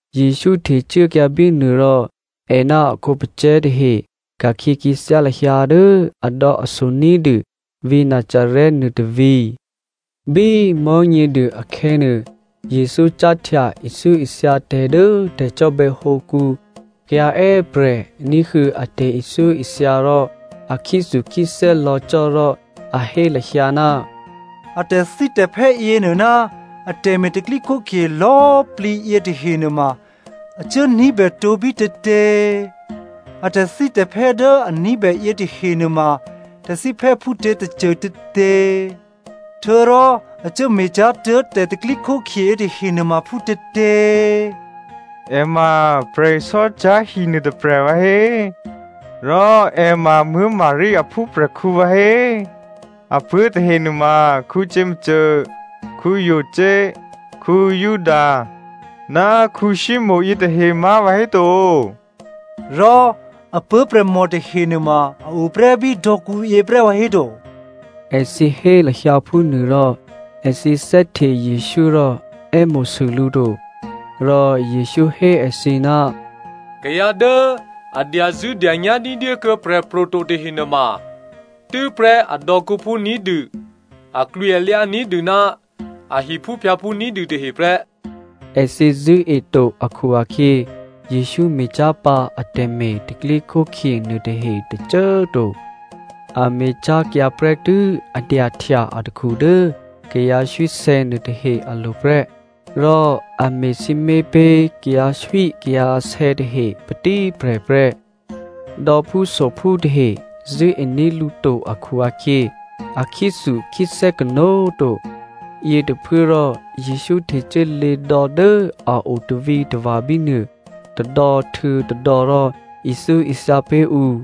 Jesǔ htecuốkyǎ bínuô rò è ná a khǒpacè̤̌ tahe ka̤khyě khyěthyá lahyǎ dố adò̌aso ní̤dû vǐ̤ Nazarè nuôtôvǐ̤. Bí Mò̤́nyěduô akhè̌nuô, Jesǔ cáhtya ithyóithya tè̤ dố tè̤cò́bè̌hǒkǔ. Kayǎ è́prè̤ ní̤huô̌ a tè̤ithyóithya rò a khyéthukhyéthè́ lò̌ cò́ rò a hé lahyǎ, “A tè̤thítè̤phè́ yěnuô ná atè̤me̤ tè̤pro̤tè̤prya̤ lò̌꤮ plǐ yětahe nuôma a cuốní̤bè tǒ bítětě? A tè̤thítè̤phè́ dố a ní̤bè yětahe nuôma tè̤thíphè́ phútětôcô tětě? Htuô̌rò a cuốme̤ cyá̤ tuố̤ tè̤pro̤tè̤prya̤ yětahe nuôma phútětě? È ma prè̤sò́cyá̤hi nuôtôprè̤ vǎhé? Rò è ma Maria aphúprè̤khǔ vǎhé? Apuố̤ tahe nuôma Jakomo, Jose, Juda, ná Simonè yětahe má̤ vǎhéto? Rò apuố̤prè̤mò tahe nuôma a o prè́ bí dò̌kǔyě prè́ vǎhéto?” Èthǐ hé lahyǎ phúnuôrò, èthǐ thè́hte Jesǔ rò è́mo̤sû lǔ to. Rò Jesǔ hé èthǐ, “Kayǎ dố a dyazṳ̂́dyanyá̤ ní̤dyékuô̌ prè̤pro̤ to tahe nuôma tû́prè́ adò̌kǔphú ní̤dû, aklwǐalyǎ ní̤dû ná a hiphúphyǎphú ní̤dû tahe prè́.” Èthǐ zṳ̂́e to akhu-akhyě Jesǔ me̤cyá̤ pǎ atè̤me̤ tè̤pro̤tè̤prya̤ nuôtahe tôcô꤮ to, a me̤cyá̤kyǎ prè́tû́ a dyahtya atakhu dố kayǎ swísè̌ nuôtahe alo̤ prè́, rò a me̤ sǐmé̤ pé̤ kayǎswíkayǎsè̌ tahe patíprè̤ prè́. Dò̌phúsophú tahe zṳ̂́ení̤ lǔ to akhu-akhyě a khyéthukhyéthè́ kanó̤꤮ to. Yětôphuốrò Jesǔ htecuốlě dò̌ dố a o tavǐtava̤ bínuô tôdò̌htuô̌tôdò̌ rò ithyóithya pé̤ ǔ.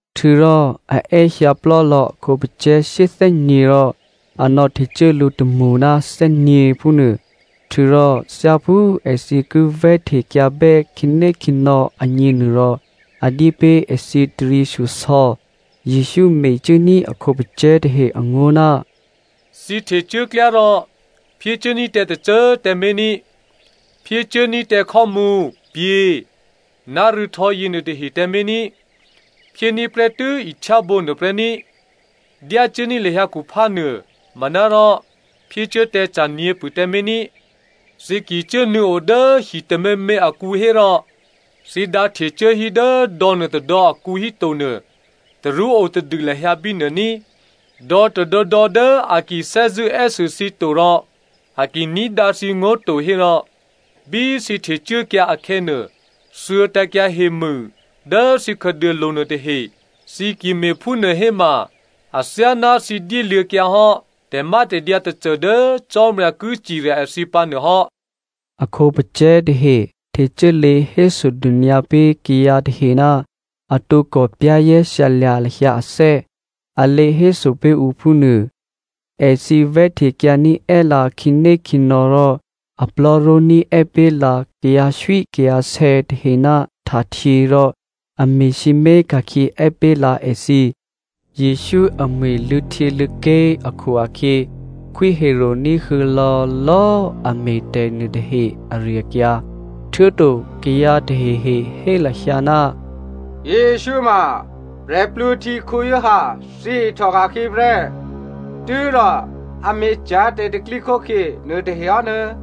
Htuô̌rò a è́hyǎ plò́lò̌ a khǒpacè̤̌ shyéthè́nyě̤ rò a nò̌htecuố lǔ tômṳ ná thè́nyě̤ phúnuô. Htuô̌rò thyáphú èthǐ ki vè̤́htekyǎbè́ khǐnékhǐnò̌ agněnuôrò, a dyé pé̤ èthǐ taryěshyosò̌. Jesǔ mecuốní̤ a khǒpacè̤̌ tahe angó̤, “Thǐ htecuốklyá rò phyécuốní̤ tǎ tôcô꤮ tǎmé̤ ní, phyécuốní̤ tǎ khò́mǔ, pyě̤, ná rû̌htò̌ yěnuôtahe tǎmé̤ ní꤮. Phyéní̤ prè́tû́ ihtyábǒ nuô prè́ ní꤮. Dyácuốní̤ lahyǎ khuphá nuô manárò phyécuố tǎ ca̤ nyě̤pṳ̂ tǎmé̤ ní꤮. Thǐ ki cuốnuô̌ o dố hi tôměmě akǔ hérò, thǐ dǎ htecuố hí dố dò̌ nuôtôdò̌ akǔ híto nuô, tarú o tadû lahyǎ bínuô ní꤮. Dò̌ tôdò̌dò̌ dố a ki thè́zṳ̂́ è́sû thǐ to rò a ki ní̤dǎ thǐngó̤ to hérò bí thǐ htecuốkyǎ akhè̌nuô, thuô̌tǎ̤kyǎ hemû dố thǐ khǎduôlo̤ nuôtahe, thǐ ki me̤phúnuô héma athyáná thǐ dyéluô̌kyǎhò́ tè̤mátè̤dyǎ tôcô dố Cò́marya ki cirya èthǐ pǎ nuôhò́.” A khǒpacè̤̌ tahe htecuốlě hésodônyǎ pé̤ kayǎ tahe ná a tǒkò za̤ ní̤dû lahyǎ ané̤, a lě héso pé̤ ǔ phúnuô. Èthǐ vè̤́htekyǎní̤ è́lǎ khǐnékhǐnò̌ rò a plò̤́ró̤ní̤ è́ pé̤ lǎ kayǎswíkayǎsè̌ tahe ná htahtyě rò a me̤sǐmé̤ ka̤khyě è́ pé̤ lǎ èthǐ. Jesǔ amwi̤ luô̌htyěluô̌ké̤ akhu-akhyě Khwí Herodè ní̤huô̌ lò̌lò̌꤮ a me̤ tè̤ nuôtahe ari-akyǎ. Htuô̌to kayǎ tahehe hé lahyǎ, “Jesǔ ma Giovanni Baptista thyěihtòka̤khyě prè́, tû́rò a me̤cyá̤ tè̤pro̤tè̤prya̤ nuôtahe hò́.”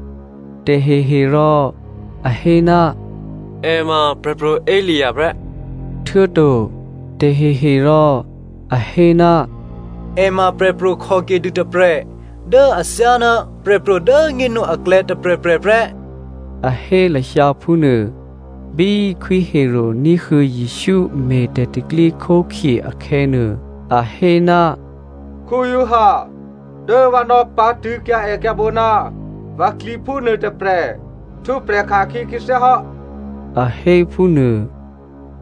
Taheherò a hé, “È ma Prè̤pro̤ Elia prè́.” Htuô̌to tahehe rò a hé, “È ma prè̤pro̤ khòkedû tôprè̤ dố athyáná prè̤pro̤ dố꤮ nyénu aklè̌ tôprè̤prè̤ prè́,” a hé lahyǎ phúnuô. Bí Khwí Herodè ní̤huô̌ Jesǔ me̤ tè̤pro̤tè̤prya̤ akhè̌nuô, a hé, “Giovanni dố vǎ nò̌pǎ̤tṳ̂̌kyǎ èkyǎ̤bǒ ná vǎ klyěphú nuôtôprè̤ htwǒprè̤ ka̤khyě khyěthyá hò́,” a hé phúnuô.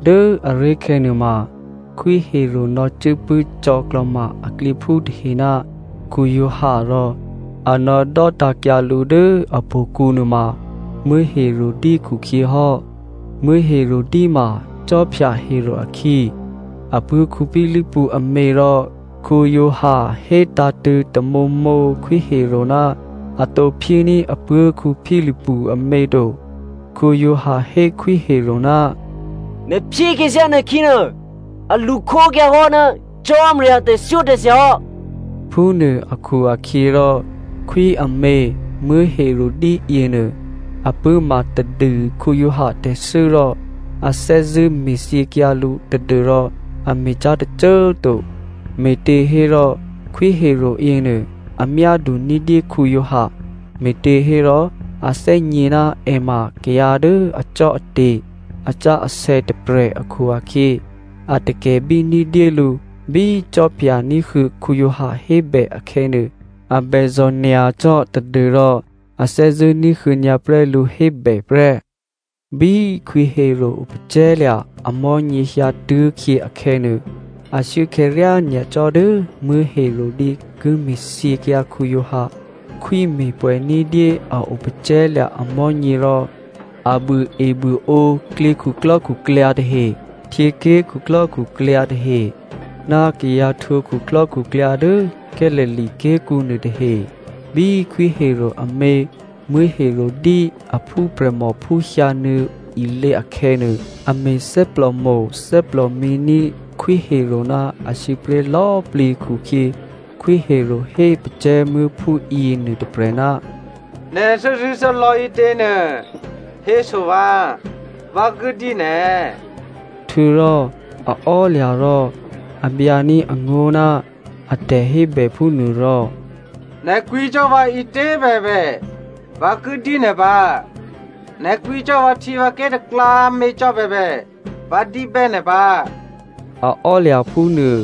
Dố aré̤khè̌nuô ma Khwí Herodè nò̌cuốpṳ̂́ cò̌klò̤ma aklyěphú tahe ná Giovanni rò a nò̌dò́tǎ̤kyǎ lǔ dố htò̌kǔ nuôma Herodia khukhyě hò́. Herodia ma Khwí Herodè akhǐ, apuố̤ Philipu amě rò Giovanni hétǎ̤tṳ̂̌ tamǒmǒ Khwí Herodè ná a tǒ phyéní̤ apuố̤ Philipu amě to. Giovanni hé Khwí Herodè, “Nè̤ phyé khyěthyá nè̤ khǐnuô a lṳkhókyǎ hò́ ná Cò́marya tè̤thyótè̤thya hò́.” Phúnuô akhu-akhyěrò khwí amě Herodia yěnuô a pṳ̂́ma tadû Giovanni tè̤thû́ rò a thè́zṳ̂́ me̤thyěkyǎ lǔ tadû́rò a me̤cyá̤ tôcô꤮ to. Me̤těhérò Khwí Herodè yěnuô a myádu ní̤dyé Giovanni, me̤těhérò a thè́gně ná è ma kayǎ dố acò́ate̤ asǎsè̌ tôprè̤ akhu-akhyě, a takè̤bí ní̤dyé lǔ. Bí khwí ní̤huô̌ Giovanni hébè akhè̌nuô, a bèzò̤ nyacò́ tadû́rò a thè́zṳ̂́ ní̤huô̌ nyǎprè́ lǔ hébè prè́. Bí Khwí Herodè opacè̤̌lya̤ amò̤́nyě hyǎtuố̤khyě akhè̌nuô, ashuốakhè̌ ryányacò́ dố Herodia ki me̤thyěkyǎ Giovanni. Khwí me̤pwè̌ ní̤dyé a opacè̤̌lya̤ amò̤́nyě rò a buôebuôǒ klyě khuklò́khuklyǎ tahe, htyěké̤ khuklò́khuklyǎ tahe, ná kayǎ htwǒ khuklò́khuklyǎ dố Galilea ké̤kǔ nuôtahe. Bí Khwí Herodè amě Herodia aphúprè̤mòphú hyǎnuô̌ ilě akhè̌nuô, a me̤ thè́plòmo̤ thè́plòmǐ ní̤ Khwí Herodè ná asǐpré̤ lò̌꤮ plǐ khukhyě Khwí Herodè hé pacè̤̌muố̤phú yěnuô tôprè̤, “Nè̤ thè́zṳ̂́thè́lò̌ ǐtěnuô héso vǎ, vǎ ki dyé nè̤.” Htuô̌rò a ò́lya̤ rò a byǎní̤ angó̤ ná a tè̤hébè phúnuô rò “Nè̤ kwǐ cò́ vǎ ǐtě꤮ bèbè vǎ ki dyé nè̤ pǎ, nè̤ kwǐ cò́ vǎhtyěvǎké̤ taklǎmě cò́ bèbè, vǎ dyébè́ nè̤ pǎ,” a ò́lya̤ phúnuô.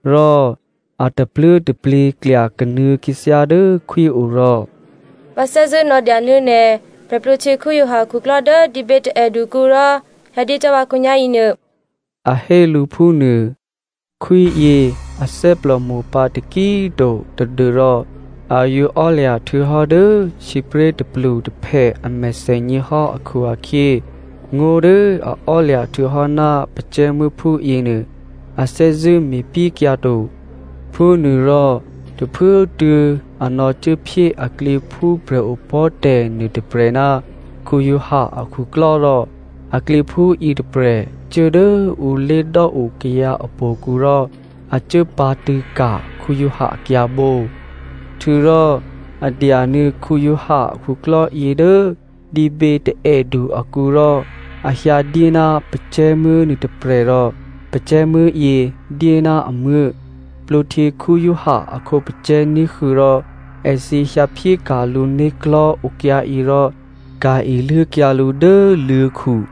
Rò a tapluố̤taplyě klyakanuô̌ khyěthyá dố khwí o rò “Vǎ thè́zṳ̂́ nò̌dya nuô̌ nè̤ Giovanni Baptista akhuklò́ dố dǐbě taè̌dukǔ rò hyǎdyé cò́ vǎ khǒnyá̤yěnuô” a hé lǔ phúnuô. Khwíyě a thè́plòmo̤ pǎtaki꤮ to tadû́rò a yǒ ò́lya̤ htuô̌hò́ dố sǐpré̤ tôplutôphè a mèthènyě hò́ akhu-akhyě ngó̤ dố a ò́lya̤ htuô̌hò́ ná pacè̤̌muố̤phú yěnuô, a thè́zṳ̂́ me̤pyékyǎ to. Phúnuôrò tôphuốtuô̌ a nò̌cuốphyé aklyěphú prè̤opò̤́tè̤ nuôtôprè̤ ná Giovanni akhuklò́ rò aklyěphú yětôprè̤ cuố dố ǔ lé̤dò́o kayǎ htò̌kǔ rò a cuốpǎ̤tṳ̂̌ ka̤ Giovanni akyǎ̤bǒ. Htuô̌rò a dyanuô̌ Giovanni a khuklò́yě dố dǐbětaè̌du akǔ rò a hyǎdyé ná pacè̤̌muố̤ nuôtôprè̤ rò pacè̤̌muố̤yě dyé ná amuố̤. Giovanni Baptista a khǒpacè̤̌ ní̤huô̌ rò èthǐ hyǎphyéka̤ lǔ né̤klò̤́ okyǎyě rò ka̤ iluốkyǎ lǔ dố luô̤̌khu.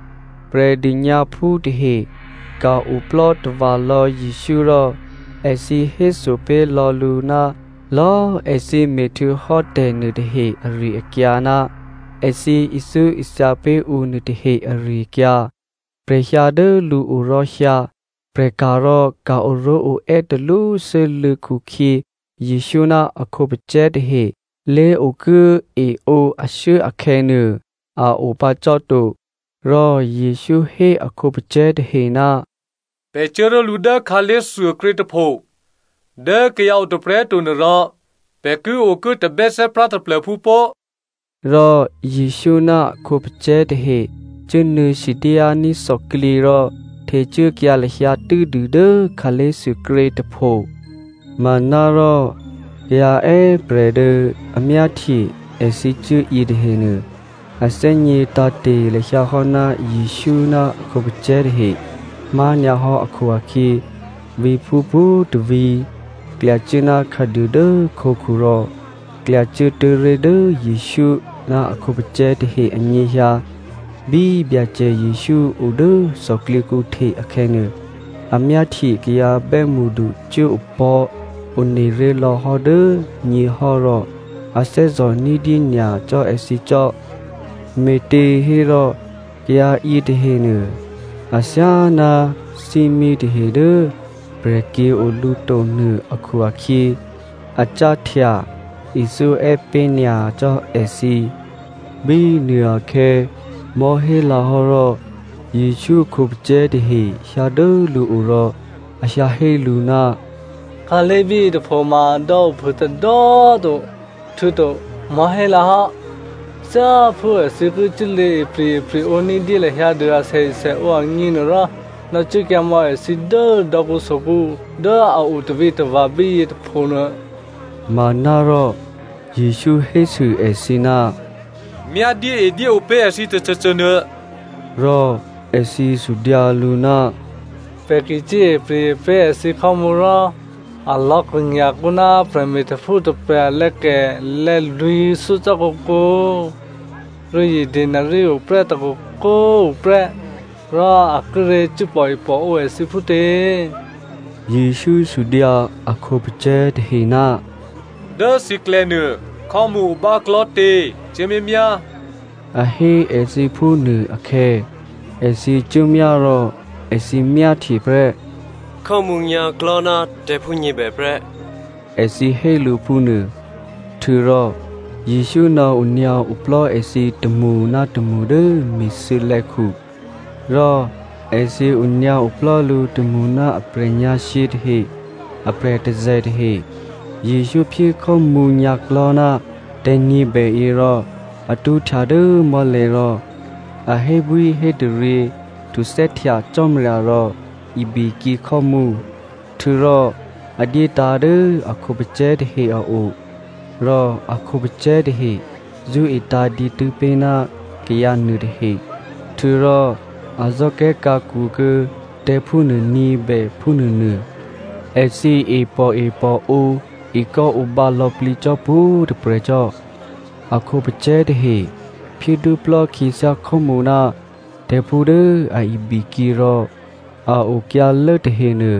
Prè̤dônyǎphú tahe ka̤-oplò́ tava̤lò̌ Jesǔ rò èthǐ héso pé̤lò̌ lǔ ná lò̌꤮ èthǐ me̤htuô̌hò́ tè̤nuôtahe ari-akyǎ ná èthǐ ithyóithya pé̤ ǔ nuôtahe ari-akyǎ. Prè̤ hyǎ dố lǔo rò hyǎ, prè̤ka̤ rò ka̤ oró̤oè́ talwósû́lû̌ khukhyě Jesǔ ná a khǒpacè̤̌ tahe lé̤okuố eǒ ashuốkhè̌nuô꤮ a opǎ cò́ to, rò Jesǔ hé a khǒpacè̤̌ tahe, “Pè̤ cuố ró̤lǔ dố khǎlé̤thuôkrě tôpho dố kayǎ o tôprè̤꤮ to nuô rò pè̤ ki okuố tabè́thè́prá taplô̤phú pó꤮.” Rò Jesǔ ná a khǒpacè̤̌ tahe cuốnuô̌ sidyání̤ thòklyě rò htecuốkyǎ lahyǎ tû́dû dố khǎlé̤thuôkrě tôpho. Manárò kayǎ è́prè̤ dố a myáhtye èthǐ cuố yětahenuô, a thè́gně tǎ̤te̤ lahyǎ hò́ ná Jesǔ ná a khǒpacè̤̌ tahe má̤nyǎhò́ akhu-akhyě, vǐ̤phú pwǒ̤tôvǐ̤ klyacuố ná khǎduô dố khǒkhu rò klyacuốtuố̤ ré̤ dố Jesǔ ná a khǒpacè̤̌ tahe anyěhyǎ. Bí Byacè Jesǔ o dố thòklyěkǔ hte akhè̌nuô, a myáhtye kayǎ bè́mṳdu cuố opò̤́ one ré̤ lò̌hò́ dố nyěhò́ rò a thè́zò̤ ní̤dyé nyacò́ èthǐ cò́, me̤těhérò kayǎ yětahenuô athyáná thímí tahe dố prè̤kyě̤ o lǔ to nuô akhu-akhyě a cáhtya ithyó è́pé̤ nyacò́ èthǐ. Bínuô akhè̌ mò̤́hélǎ hò́ rò Jesǔ a khǒpacè̤̌ tahe hyǎ dố lǔo rò a hyǎhé lǔ, “Khǎlé̤ bíyětôpho ma dò̌ ophû tôdò̌꤮ to, htuô̌to mò̤́hélǎ hò́. Thyáphú èthǐ ki cuốlě ipri̤-epri̤ǒ ní̤dyé lahyǎ dû asèesèǒ agněnuôrò, nò̌cuốkyǎ mò̌ èthǐ dố dò̌kǔsokǔ dố a o tavǐtava̤ bíyě tôpho nuô.” Manárò Jesǔ hésû èthǐ, “Myá dyéedyéǒ pé̤ èthǐ tôcôcô nuô.” Rò èthǐ sudyǎ lǔ, “Pè̤ ki cuốipri̤ pé̤ èthǐ khò́mǔ rò alò̌ krṳ̂nya̤kǒ ná prè̤me̤tè̤phú tôprè̤ alè̌kè lè̌lwǐ̤thyó cò́ kǒkǒ, rû̌zye denari o prè́ tôkoko꤮ tuô̌ prè́ rò a kíré̤ cuố pòepòǒ èthǐ phútě?” Jesǔ sudyǎ a khǒpacè̤̌ tahe, “Dố thǐklè̌nuô khò́mǔ o báklò̤́tě? Cuốmyámyá,” a hé èthǐ phúnuô akhè̌, èthǐ cuốmyá rò èthǐ myáhtye prè́, “Khò́mǔ nyǎ̤klò̤́ ná tè̤̌phú nyě̤bè prè́,” èthǐ hé lǔ phúnuô. Htuô̌rò Jesǔ nò̌onyǎ oplò́ èthǐ tômṳ ná tômṳ dố mi̤thuô̌lè̌khu. Rò èthǐ onyǎoplò́ lǔ tômṳ ná aprè̤ nyǎ̤shyě tahe aprè̤ tôzè̤ tahe. Jesǔ phyé khò́mǔ nyǎ̤klò̤́ ná tè̤̌ nyě̤bèyě rò a tṳ́htya dố mò́lè̤̌ rò a hébwíhétaryě htuthè́htya Cò́marya rò ibikyě khò́mǔ. Htuô̌rò a dyétǎ̤ dố a khǒpacè̤̌ tahe a o. Rò a khǒpacè̤̌ tahe zṳ́etǎ̤ dǐtû́ pé̤ ná kayǎ nuôtahe. Htuô̌rò a zò́kè̤́khǎkwo kuô̌ tè̤̌phú nuônyě̤bè phúnuônuô. Èthǐ e pòepòǒ ekò́ǒbǎ lò̌plǐ cò́ pwǒ̤꤮ tôprè̤ cò́. A khǒpacè̤̌ tahe phyédwóplò́ khyěthyá khò́mǔ ná tè̤̌phú dố a ibikyě rò a okyǎlố tahenuô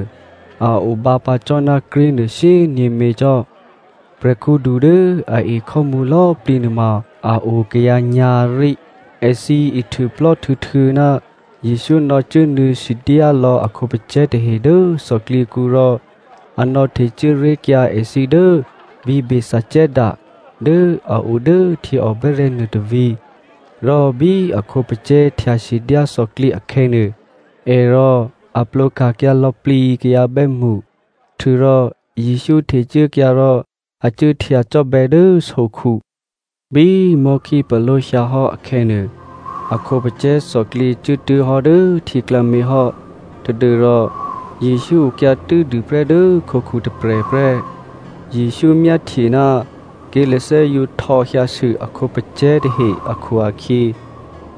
a obǎ pǎ cò́ ná krí̤nuô shyényě̤mě cò́. Prè̤khǔdu dố a e khò́mǔ lò̌꤮ plǐ nuôma a o kayǎ nyǎ̤rí. Èthǐ ihtuôplò́ htuô̌htuô̌ ná Jesǔ nò̌cuốnuô̌ sidyá lò̌ a khǒpacè̤̌ tahe dố thòklyěkǔ rò a nò̌htecuố ré̤kyǎ èthǐ dố vǐ̤ Bethsaida dố a o dố htyěòbè́rè̤̌ nuôtôvǐ̤. Rò bí a khǒpacè̤̌ htyasidyá thòklyě akhè̌nuô, è rò a plwǒka̤kyǎ lò̌plǐ kayǎ bè́mṳ. Htuô̌rò Jesǔ htecuốkyǎ rò a cuốhtya cò́bè̌ dố sokhu. Bí mò̤́khípaló̤ hyǎ hò́ akhè̌nuô, a khǒpacè̤̌ thòklyě cuốtuố̤ hò́ dố htyěklǎmě hò́ tadû́rò Jesǔ okyǎ tû́dû prè́ dố khǒkhu tôprè̤ prè́. Jesǔ myáhtye ná ké̤lathè́ yǒ htò̌hyǎsû a khǒpacè̤̌ tahe akhu-akhyě,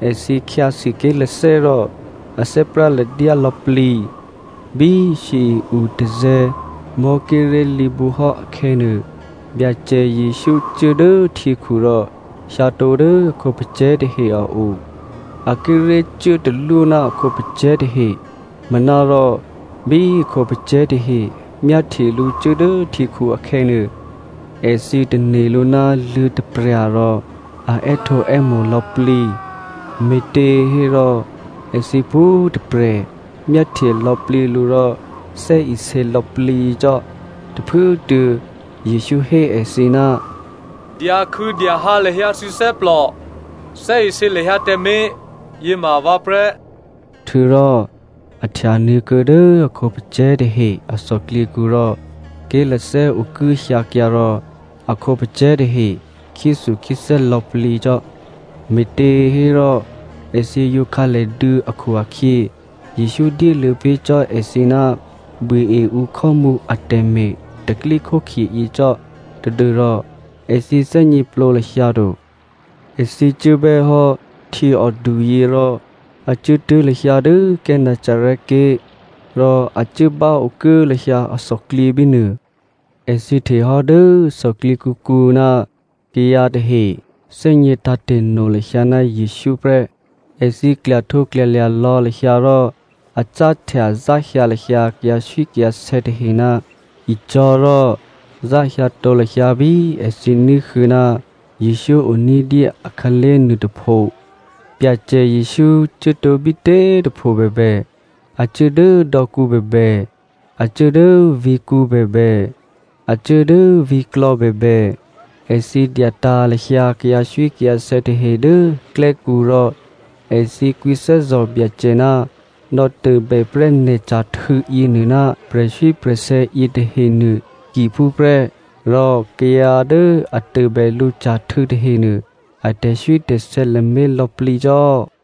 èthǐ khyǎsû ké̤lathè́ rò a thè́práladyá lò̌plǐ. Bí shyěi-utazè̤̌ mò̤́ kíré̤ lǐbǔhò́ akhè̌nuô, Byacè Jesǔ cuố dố htyěkhu rò hyǎtǒ dố a khǒpacè̤̌ tahe a o. A kíré̤ cuốtalwó ná a khǒpacè̤̌ tahe. Manárò bí a khǒpacè̤̌ tahe myáhtye lǔ cuố dố htyěkhu akhè̌nuô, èthǐ tane̤ lǔ ná luô̤̌taprya̤ rò a è́htǒè́mo̤ lò̌plǐ. Me̤těhérò èthǐ pwǒ̤꤮ tôprè̤ myáhtye lò̌plǐ lǔ rò thè́isě lò̌plǐ cò́. Tôphuốtuô̌ Jesǔ hé èthǐ, “Dyakhû̌dyahǎ lahyǎ thǐ thè́plò. Thè́isě lahyǎ tǎmé̤, yěma vǎ prè́.” Htuô̌rò a htyanuô̌kuô̌ dố a khǒpacè̤̌ tahe a thòklyěkǔ rò ké̤lathè́ okuốhyǎkyǎ rò a khǒpacè̤̌ tahe khyéthukhyéthè́ lò̌plǐ cò́. Me̤těhérò èthǐ yǒ khǎlèduô̌ akhu-akhyě Jesǔ dyéluô̌ pé̤ cò́ èthǐ ná buôe ǔ khò́mǔ atè̤me̤ tè̤pro̤tè̤prya̤ yě cò́ tadû́rò èthǐ thè́gněplǒ lahyǎ to. Èthǐ cuốbè́ hò́ htyěòduyě rò a cuốtuố̤ lahyǎ dố Gennesaret ké̤ rò a cuố báokuố lahyǎ athòklyě bínuô. Èthǐ hte hò́ dố thòklyěkǔkǔ ná kayǎ tahe thè́gnětǎ̤te̤no lahyǎ ná Jesǔ prè́. Èthǐ klyahtǒklyalya̤ lò̌ lahyǎ rò a cáhtya záhyǎ lahyǎ kayǎswíkayǎsè̌ tahe ná icò̤̌ rò záhyǎtǒ lahyǎ bí èthǐ ní̤huô̌ ná Jesǔ o ní̤dyé akhǎlé̤ nuôtôpho. Byacè Jesǔ cuốtǒ bítě꤮ tôpho bèbè, a cuố dố dò̌kǔ bèbè, a cuố dố vǐ̤kǔ bèbè, a cuố dố vǐ̤klò̌ bèbè, èthǐ dyatǎ̤ lahyǎ kayǎswíkayǎsè̌ tahe dố klè́kǔ rò èthǐ kwǐthè́zò̤ Byacè ná nò̌tôbè prè́ nè̤ ca̤htû̌ yěnuô ná prè̤swí prè̤sè̌ yětahenuô takiphúprè́. Rò kayǎ dố a tôbè lǔ ca̤htû̌ tahenuô, a tè̤swítè̤sè̌ lamé̤ lò̌plǐcò́.